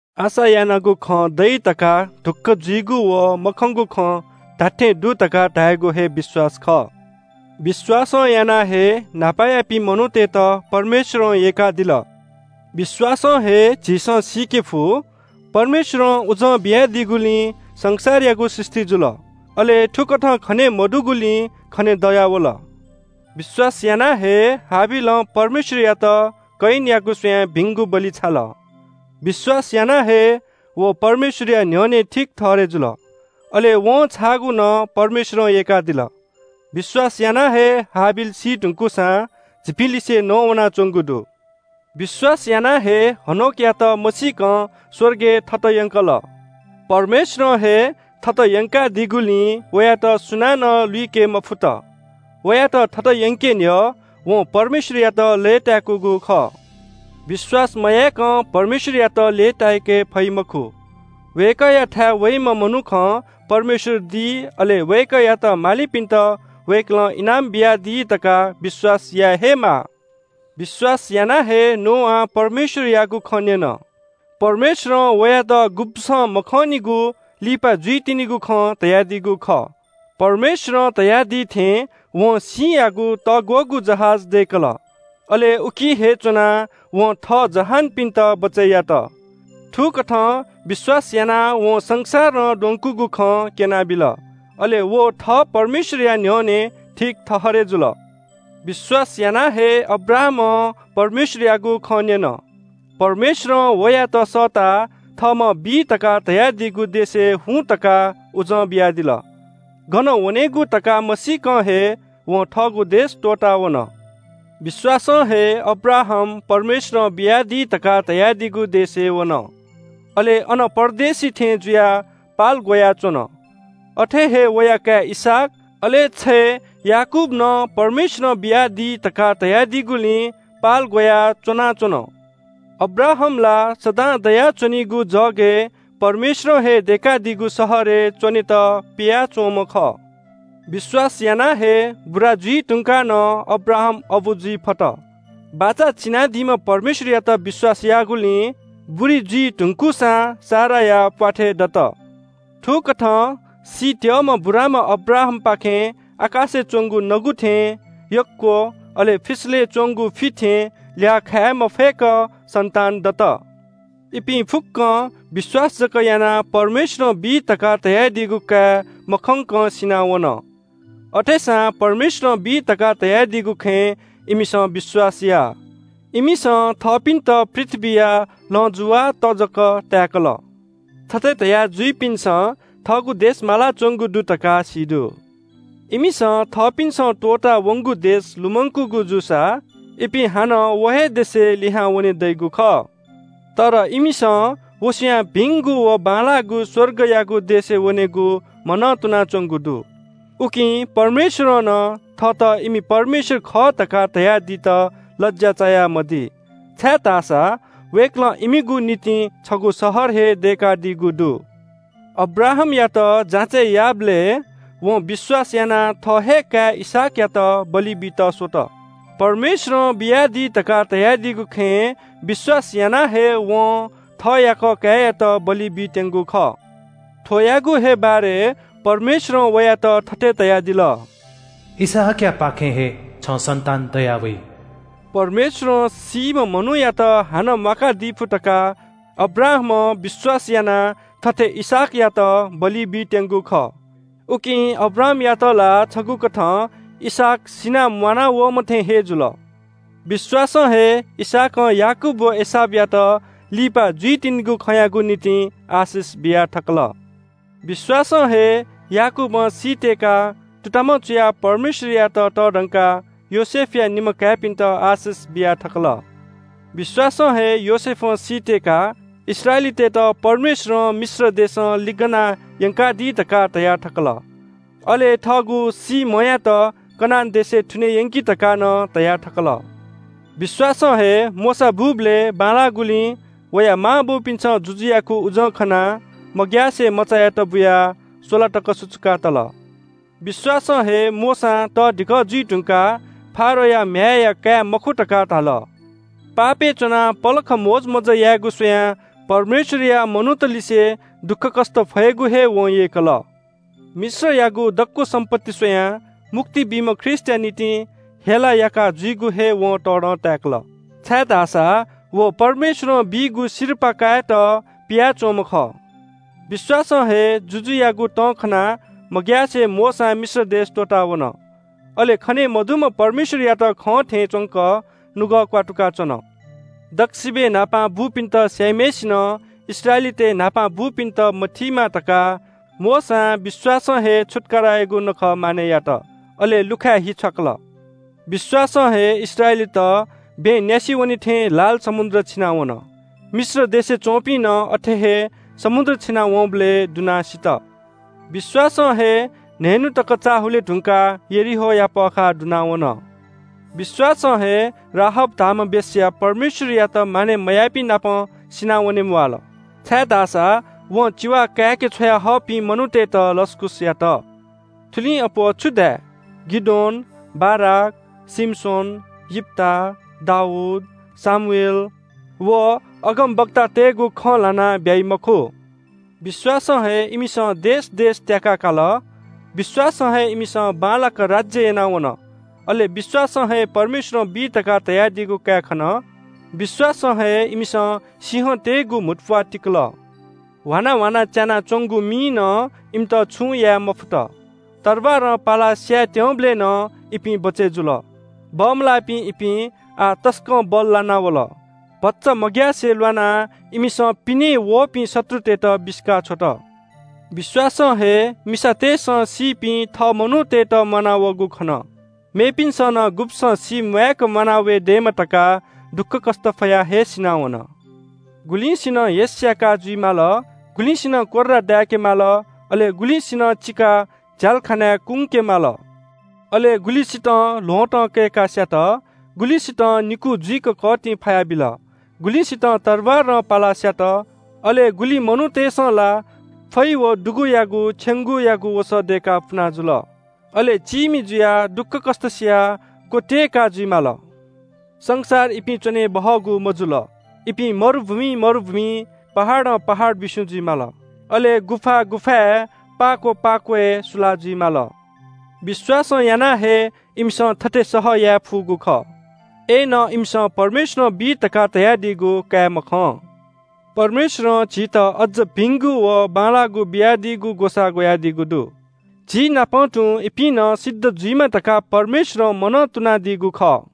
आशा यानागु खँ दइ धकाः ढुक्‍क जुइगु व मखंगु खँ धात्‍थें दु धकाः धायेगु हे विश्‍वास खः। विश्‍वासं यानाः हे न्‍हापायापिं मनूतय्‌त परमेश्‍वरं यय्‌कादिल। विश्‍वासं हे झीसं सीके फु, परमेश्‍वरं उजं बियादीगुलिं संसारयागु सृष्‍टि जुल, अले थुकथं खने मदुगुलिं खनेदयावल। विश्‍वासं हे हाबिलं परमेश्‍वरयात कयिनयागु स्‍वयाः भिंगु बलि छाल। विश्‍वास यानाः हे व परमेश्‍वरया न्‍ह्यःने ठीक ठहरय् जुल। अले वं छाःगु नं परमेश्‍वरं यय्‌कादिल। विश्‍वास यानाः हे हाबिल सी धुंकूसां झीपिंलिसे नवानाच्‍वंगु दु। विश्‍वासं हे हनोकयात मसीकं स्‍वर्गय् थत यंकल। परमेश्‍वरं हे थत यंकादीगुलिं वयात सुनानं लुइके मफुत। वयात थत यंके न्‍ह्यः वं परमेश्‍वरयात लय्‌ताय्‌कूगु खः। विश्‍वास मयाय्‌कं परमेश्‍वरयात लय्‌ताय्‌के फइ मखु। वय्‌कःयाथाय् वइम्‍ह मनुखं परमेश्‍वर दि, अले वय्‌कःयात मालिपिन्‍त वय्‌कलं इनाम बियादी धकाः विश्‍वास याये हे माः। विश्‍वासं हे नोआं परमेश्‍वरयागु खँ न्‍यन। परमेश्‍वरं वयात गुब्‍सं मखंनिगु, लिपा जुइतिनिगु खँ धयादीगु खः। परमेश्‍वरं धयादी थें वं सिँयागु तःग्‍वःगु जहाज दय्‌कल। अले उकी हे च्‍वनाः वं थः जहानपिन्‍त बचय् यात। थुकथं विश्‍वास यानाः वं संसारं द्वंकूगु खँ क्‍यनाबिल, अले व थः परमेश्‍वरया न्‍ह्यःने ठीक ठहरय् जुल। विश्‍वासं हे अब्राहामं परमेश्‍वरयागु खँ न्‍यन। परमेश्‍वरं वयात सःताः थःम्‍हं बी धकाः धयादीगु देशय् हुँ धकाः उजं बियादिल। गन वनेगु धकाः मसीकं हे वं थःगु देश त्‍वःतावन। विश्‍वासं हे अब्राहाम परमेश्‍वरं बियादी धकाः धयादीगु देशय् वन, अले अन परदेशी थें जुयाः पाल ग्‍वयाः च्‍वन। अथे हे वया काय् इसहाक, अले छय् याकूब नं परमेश्‍वरं बियादी धकाः धयादीगुलिं पाल ग्‍वयाः च्‍वंच्‍वन। अब्राहाम ला सदां दयाच्‍वनीगु जगय् परमेश्‍वरं हे दय्‌कादीगु शहरय् च्‍वनेत पियाच्‍वंम्‍ह खः। विश्‍वासं हे बुरा जुइ धुंकाः नं अब्राहाम अबु जुइ फत। बाचा चिनादीम्‍ह परमेश्‍वरयात विश्‍वास याःगुलिं बुरी जुइ धुंकूसां साराया प्‍वाथय् दत। थुकथं सीत्‍यःम्‍ह बुराम्‍ह अब्राहामपाखें आकाशय् च्‍वंगु नगु थें यक्‍व, अले फिसलय् च्‍वंगु फि थें ल्‍याः खाये मफय्‌क सन्‍तान दत। इपिं फुक्‍कं विश्‍वास जक यानाः परमेश्‍वरं बी धकाः धयादीगु काये मखंकं सिनावन। अथेसां परमेश्‍वरं बी धकाः धयादीगु खँय् इमिसं विश्‍वास याः। इमिसं थःपिन्‍त पृथ्‍वीया लँजुवाःत जक ताय्‌कल। थथे धया जुइपिन्‍सं थःगु देश मालाच्‍वंगु दु धकाः सी दु। इमिसं थःपिन्‍सं त्‍वःता वंगु देश लुमंकूगु जूसा इपिं हानं व हे देशय् लिहां वने दइगु खः। तर इमिसं व स्‍वयाः भिंगु व बांलाःगु स्‍वर्गयागु देशय् वनेगु मनंतुनाच्‍वंगु दु। उकिं परमेश्‍वरं नं थःत इमि परमेश्‍वर खः धकाः धयादीत लज्‍या चायामदी, छाय्‌धाःसा वय्‌कलं इमिगु निंतिं छगू शहर हे दय्‌कादीगु दु। अब्राहामयात जाँचय् याःबलय् वं विश्‍वास यानाः थः हे काय् इसहाकयात बलि बीत स्‍वत। परमेश्‍वरं बियादी धकाः धयादीगु खँय् विश्‍वास यानाः हे वं थः याकः काय्‌यात बलि बीत्‍यंगु खः। थ्‍वयागु हे बारे परमेश्‍वरं वयात थथे धयादिल – “इसहाकयापाखें हे छं सन्‍तान दयावइ।” परमेश्‍वरं सीम्‍ह मनूयात हानं म्‍वाकादी फु धकाः अब्राहामं विश्‍वास यानाः थथे इसहाकयात बलि बीत्‍यंगु खः। उकिं अब्राहामयात ला छगूकथं इसहाक सिनाः म्‍वानावःम्‍ह थें हे जुल। विश्‍वासं हे इसहाकं याकूब व एसावयात लिपा जुइतिनिगु खँयागु निंतिं आशिष बिया थकल। विश्‍वासं हे याकूबं सीत्‍यय्‌काः तुतामं चुयाः परमेश्‍वरयात तःधंकाः योसेफया निम्‍ह काय्‌पिन्‍त आशिष बिया थकल। विश्‍वासं हे योसेफं सीत्‍यय्‌काः इस्राएलीतय्‌त परमेश्‍वरं मिश्र देशं लिगना यंकादी धकाः धया थकल। अले थःगु सीम्‍हयात कनान देशय् थुने यंकि धकाः नं धया थकल। विश्‍वासं हे मोशा बूबलय् बांलाःगुलिं वया मांबौपिन्‍सं जुजुयागु उजं खनाः मग्‍यासे मचायात बुयाः स्‍वला तक सुचुका तल। विश्‍वासं हे मोशां तःधिकः जुइ धुंकाः फारोहया म्‍ह्याय्‌या काय् मखु धकाः धाल। पापय् च्‍वनाः पलख मोजमज्‍जा यायेगु स्‍वयाः परमेश्‍वरया मनूतलिसे दुःखकष्‍ट फयेगु हे वं यय्‌कल। मिश्रयागु दक्‍व सम्‍पत्ति स्‍वयाः मुक्ति बीम्‍ह ख्रीष्‍टया निंतिं हेला याका जुइगु हे वं तःधं ताय्‌कल, छाय्‌धाःसा व परमेश्‍वरं बीगु सिरपाः कायेत पियाच्‍वंम्‍ह खः। विश्‍वासं हे जुजुयागु तं खनाः मग्‍यासे मोशां मिश्र देश त्‍वःतावन। अले खने मदुम्‍ह परमेश्‍वरयात खं थें च्‍वंक नुगः क्‍वात्तुकाच्‍वन। दक्‍वसिबय् न्‍हापां बूपिन्‍त स्‍याइम्‍हय्‌सिनं इस्राएलीतय् न्‍हापा बूपिन्‍त मथीमा धकाः मोशां विश्‍वासं हे छुत्‍काराया नखः मानय् यात, अले लुखाय् हि छ्वाकल। विश्‍वासं हे इस्राएलीत बँय् न्‍यासि वने थें लाल समुद्र छिनावन। मिश्र देशय् च्‍वंपिं नं अथे हे समुद्र छिनाः वंबलय् दुनाः सित। विश्‍वासं हे न्‍हय्‌न्‍हु तक चाः हुले धुंकाः यरीहोया पःखाः दुनावन। विश्‍वासं हे राहाब धाःम्‍ह वेश्‍या परमेश्‍वरयात मानय् मयाःपिं नाप सिनावने म्‍वाःल, छाय्‌धाःसा वं चिवा काय्‌के छ्वयाहःपिं मनूतय्‌त लसकुस यात। थुलिं अप्‍वः छु धाये? गिदोन, बाराक, शिमशोन, यिप्‍ता, दाऊद, शमूएल व अगमवक्तातय्‌गु खँ ल्‍हानाः ब्‍याइ मखु। विश्‍वासं हे इमिसं देश देश त्‍याका काल। विश्‍वासं हे इमिसं बांलाक राज्‍य याना वन, अले विश्‍वासं हे परमेश्‍वरं बी धकाः धयादीगु काये खन। विश्‍वासं हे इमिसं सिंहतय्‌गु म्‍हुतुप्‍वाः तिकल। ह्वाना ह्वाना च्‍यानाच्‍वंगु मिं नं इमित छुं याये मफुत। तरवारं पालाः स्‍यायेत्‍यंबलय् नं इपिं बचय् जुल। बमलाःपिं इपिं, आः तसकं बल्‍लाना वल। भचा मग्‍यासे ल्‍वानाः इमिसं पिनें वःपिं शत्रुतय्‌त बिसिका छ्वत। विश्‍वासं हे मिसातय्‌सं सीपिं थः मनूतय्‌त म्‍वानावःगु खन। मेपिन्‍सं नं गुब्‍सं सीम्‍वाय्‌क म्‍वाना वये दयेमा धकाः दुःखकष्‍ट फयाः हे सिनावन। गुलिसिनं हेस्‍याकाः जुइ माल, गुलिसिनं कोर्रां दाय्‌के माल, अले गुलिसिनं चिकाः झ्‍यालखानाय् कुंके माल। अले गुलिसितं ल्‍वहँतं कय्‌काः स्‍यात, गुलिसितं निकू जुइक कःतिं फायाबिल, गुलिसितं तरवारं पालाः स्‍यात। अले गुलि मनूतय्‌सं ला फै व दुगुयागु छेंगूयागु वसः दय्‌काः पुनाजुल। अले चीमि जुयाः, दुःखकष्‍ट सियाः, क्‍वत्‍यय्‌काः जुइ माल। संसार इपिं च्‍वने बहःगु मजुल। इपिं मरुभूमिं मरुभूमिं, पहाडं पहाडं बिस्‍युं जुइ माल। अले गुफा गुफाय्, पाक्‍व पाक्‍वय् सुलाः जुइ माल। विश्‍वासं यानाः हे इमिसं थथे सह याये फुगु खः। अय्‌नं इमिसं परमेश्‍वरं बी धकाः धयादीगु काये मखं। परमेश्‍वरं झीत अज्‍ज भिंगु व बांलाःगु बियादीगु ग्‍वसाः ग्‍वयादीगु दु। झीनापं तुं इपिं नं सिद्ध जुइमा धकाः परमेश्‍वरं मनंतुनादीगु खः।